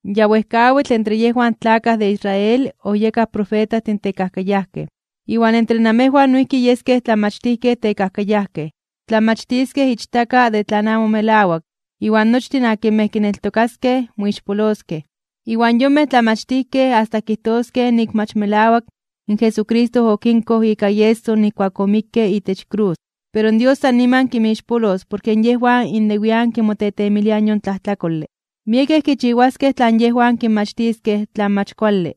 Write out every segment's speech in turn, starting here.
Ya wejkawitl entre yejwan tlakaj de Israel oyekaj profetajtin tekajkayajkej, iwan entre namejwan noijki yeskej tlamachtijkej tekajkayajkej. Tlamachtiskej ichtaka de tlan amo melawak iwan nochtin akinmej kineltokaskej, moixpoloskej. Iwan yonmej tlamachtijkej asta kijtoskej nik mach melawak in Jesucristo okinkoj ika ieso nijkuak omikke itech krus. Pero Dios san niman kinmixpolos porke yejwan innewian kimotetemiliaj yon tlajtlakole. Miekej kichiwaskej tlan yejwan kinmachtiskej tlan mach kuale.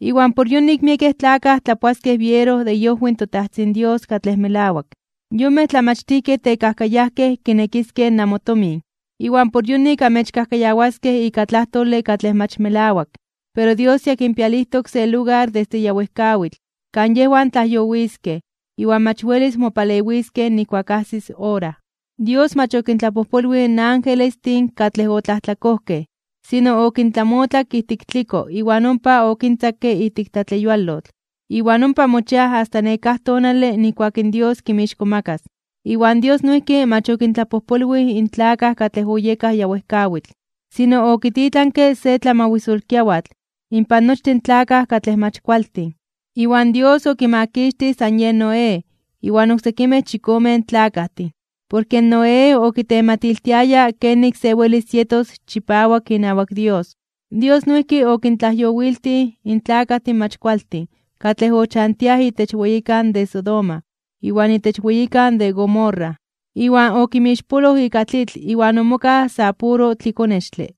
Iwan por yonik miekej tlakaj tlapoaskej biero de iojwi in toTajtzin Dios katlej melawak. Yonmej tlamachtijkej tekajkayajkej kinekiskej namotomin, iwan por yonik amechkajkayawaskej ika tlajtole katlej mach melawak. Pero Dios ya kinpialijtok se lugar desde ya wejkawitl kan yejwan tlajyowiskej iwan mach welis mopalewiskej nijkuak ajsis ora. Dios mach okintlapojpolwij in angelestin katlej otlajtlakojkej, sino okintlamotlak ijtik tliko iwan ompa okintzakke ijtik tlatleyualotl, iwan ompa mochiaj asta nekáj tonale nijkuak in Dios kinmixkomakas (kintzonmanas). Iwan Dios noijki mach okintlapojpolwij in tlakaj katlej oyekaj ya wejkawitl, sino okititlanke se tlamawisolkiawatl inpan nochtin tlakaj katlej mach kualtin. Iwan Dios okimakixtij san yen Noé iwan oksekimej chikomen tlakajtin, porke Noé okitematiltiayaj kenik se welis yetos chipawak inawak Dios. Dios noijki okintlajyowiltij in tlakajtin mach kualtin katlej ochantiaj itech weyikan de Sodoma iwan itech weyikan de Gomorra, iwan okinmixpoloj ika tlitl iwan omokaj sa puro tlikonextle.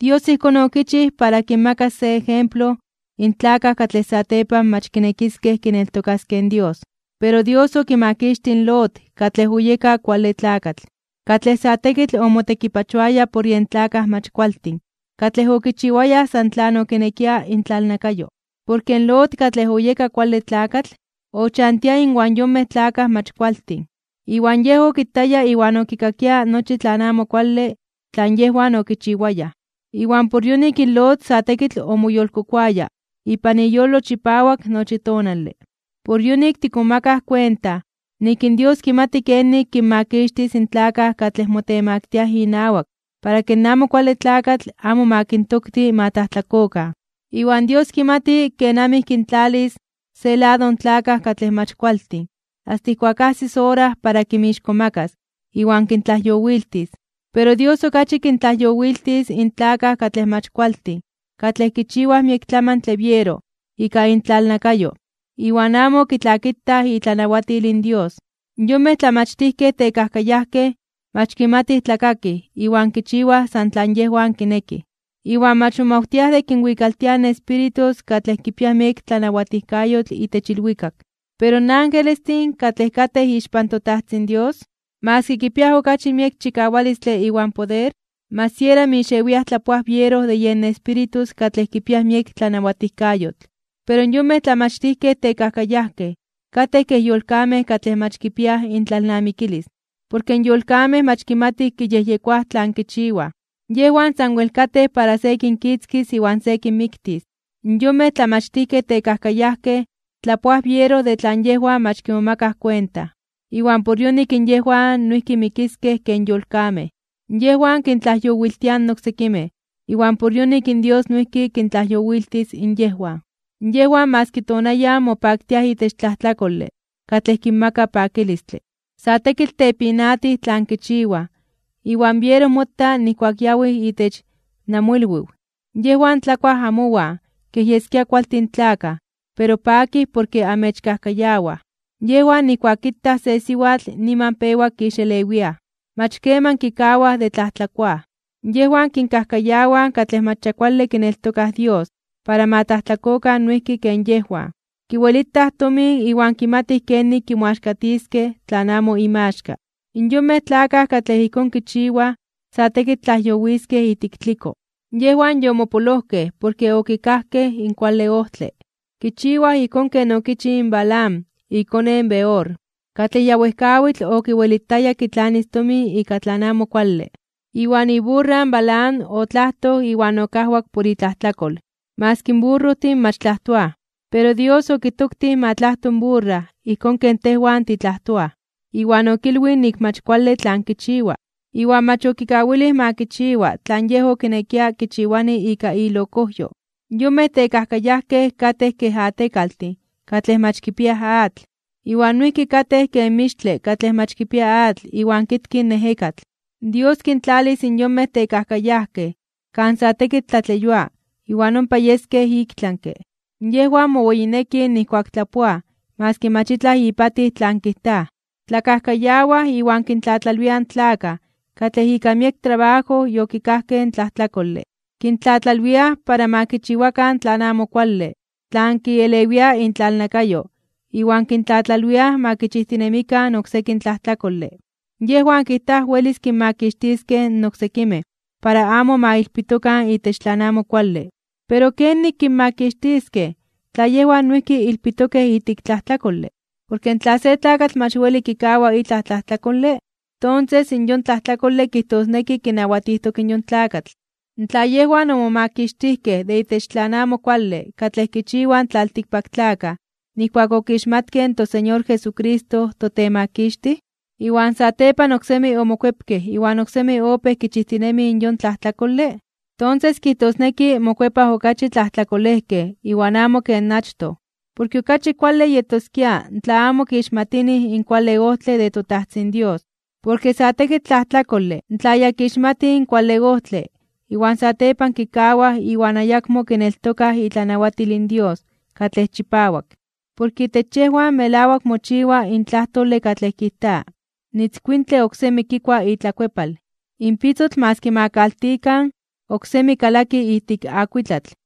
Dios ijkón okichij para kinmakas se ejemplo in tlakaj katlej satepan mach kinekiskej kineltokaskej in Dios. Pero Dios okimakixtij in Lot katlej oyeka kuale tlakatl, katlej sa tekitl omotekipachoaya por yen tlakaj mach kualtin katlej okichiwayaj san tlan okinekia intlalnakayo. Porke in Lot katlej oyeka kuale tlakatl, ochantia inwan yonmej tlakaj mach kualtin, iwan yej okitaya iwan okikakia nochi tlan amo kuale tlan yejwan okichiwayaj. Iwan por yonik in Lot sa tekitl omoyolkokoaya ipan iyolo chipawak nochi tonale. Por yonik tikmomakaj kuenta nik in Dios kimati kenik kinmakixtis in tlakaj katlej motemaktiaj (motemaktiliaj) inawak para ke in Amo Kuale Tlakatl amo ma kintokti ma tlajtlakokan. Iwan Dios kimati kenamij kintlalis se lado in tlakaj katlej mach kualtin asta ijkuak ajsis ora para kinmixkomakas (kintzonmanas) iwan kintlajyowiltis. Pero Dios okachi kintlajyowiltis in tlakaj katlej mach kualtin katlej kichiwaj miek tlamantle biero ika intlalnakayo iwan amo kitlakitaj itlanawatil in Dios. Yonmej tlamachtijkej tekajkayajkej mach kimatij tlakakij iwan kichiwaj san tlan yejwan kinekij, iwan mach momawtiaj de kinwikaltiaj in espíritus katlej kipiaj miek tlanawatijkayotl itech ilwikak. Pero in angelestin, katlej katej ixpan toTajtzin Dios, maski kipiaj okachi miek chikawalistle iwan poder, mach siera mixewiaj tlapoaj biero de yen espíritus katlej kipiaj miek tlanawatijkayotl. Pero yonmej tlamachtijkej tekajkayajkej katej kej yolkamej katlej mach kipiaj intlalnamikilis. Porke in yolkamej mach kimatij kiyejyekoaj tlan kichiwaj, yejwan sanwel katej para se kinkitzkis iwan se kinmiktis. In yonmej tlamachtijkej tekajkayajkej tlapoaj biero de tlan yejwan mach kimomakaj kuenta, iwan por yonik yejwan noijki mikiskej ken yolkamej. Yejwan kintlajyowiltiaj in oksekimej iwan por yonik in Dios noijki kintlajyowiltis in yejwan. Yejwan maski tonayan mopaktiaj itech tlajtlakole katlej kinmaka pakilistle. Sa tekitl tepinatij tlan kichiwaj iwan biero motaj nijkuak yawij itech namoilwiw, yejwan tlakuaj amowan kej yeskia kualtin tlakaj pero pakij porke amechkajkayawaj. Yejwan nijkuak kitaj se siwatl niman pewa kixelewiaj. Mach keman kikawaj de tlajtlakoaj. Yejwan kinkajkayawaj katlej mach ya kuale kineltokaj Dios para ma tlajtlakokan noijki ken yejwan. Kiwelitaj tomin iwan kimatij kenik kimoaxkatiskej tlan amo inmaxka. In yonmej tlakaj katlej ijkón kichiwaj sa tekitl tlajyowiskej ijtik tliko. Yejwan yomopolojkej porke okikajkej in kuale ojtle. Kichiwaj ijkón ken okichij in Balaam ikone in Beor, katlej ya wejkawitl okiwelitaya kitlanis tomin ika tlan amo kuale. Iwan iburra in Balaam otlajtoj iwan okajwak por itlajtlakol, maski in burrojtin mach tlajtoaj. Pero in Dios okitoktij ma tlajto in burra ijkón ken tejwan titlajtoaj, iwan okilwij nik mach kuale tlan kichiwa. Iwan mach okikawilij ma kichiwaj tlan yej okinekia kichiwani ika ilokojyo. Yonmej tekajkayajkej katej ken atekaltin katlej mach kipiaj atl, iwan noijki katej ken mixtle katlej mach kipia atl iwan kitki in ejekatl. Dios kintlalis in yonmej tekajkayajkej kan sa tekitl tlatleyua iwan ompa yeskej iktlanke (ik tlami). Yejwan moweyinekij nijkuak tlapoaj maski mach itlaj ipatij tlan kijtaj. Tlakajkayawaj iwan kintlatlalwiaj in tlakaj katlej ika miek trabajo yokikajkej in tlajtlakole. Kintlatlalwiaj para ma kichiwakan tlan amo kuale tlan kielewia intlalnakayo iwan kintlatlalwiaj ma kichijtinemikan oksekin tlajtlakole. Yejwan kijtaj welis kinmakixtiskej in oksekimej para amo ma ilpitokan itech tlan amo kuale, pero mach welis porke yejwan noijki ilpitokej ijtik tlajtlakole. Porke tla se tlakatl mach weli kikawa itlaj tlajtlakole, tonses in yon tlajtlakole kijtosneki kinawatijtok in yon tlakatl. Tla yejwan omomakixtijkej de itech tlan amo kuale katlej kichiwaj in tlaltikpaktlakaj nijkuak okixmatkej in toSeñor Jesucristo toTemakixtij, iwan satepan oksemi omokuepkej iwan oksemi opéj kichijtinemij in yon tlajtlakole, tonses kijtosneki mokuepaj okachi tlajtlakolejkej iwan amo ken achtoj. Porke okachi kuale yetoskia tla amo kixmatinij in kuale ojtle de toTajtzin Dios. Porke sa tekitl tlajtlakole tla ya kixmatij in kuale ojtle iwan satepan kikawaj iwan ayakmo kineltokaj itlanawatil in Dios katlej chipawak. Porke itech yejwan melawak mochiwa in tlajtole katlej kijta: “In itzkuintle oksemi kikua itlakuepal. In pitzotl maski ma kaltikan, oksemi kalaki ijtik akuitlatl.”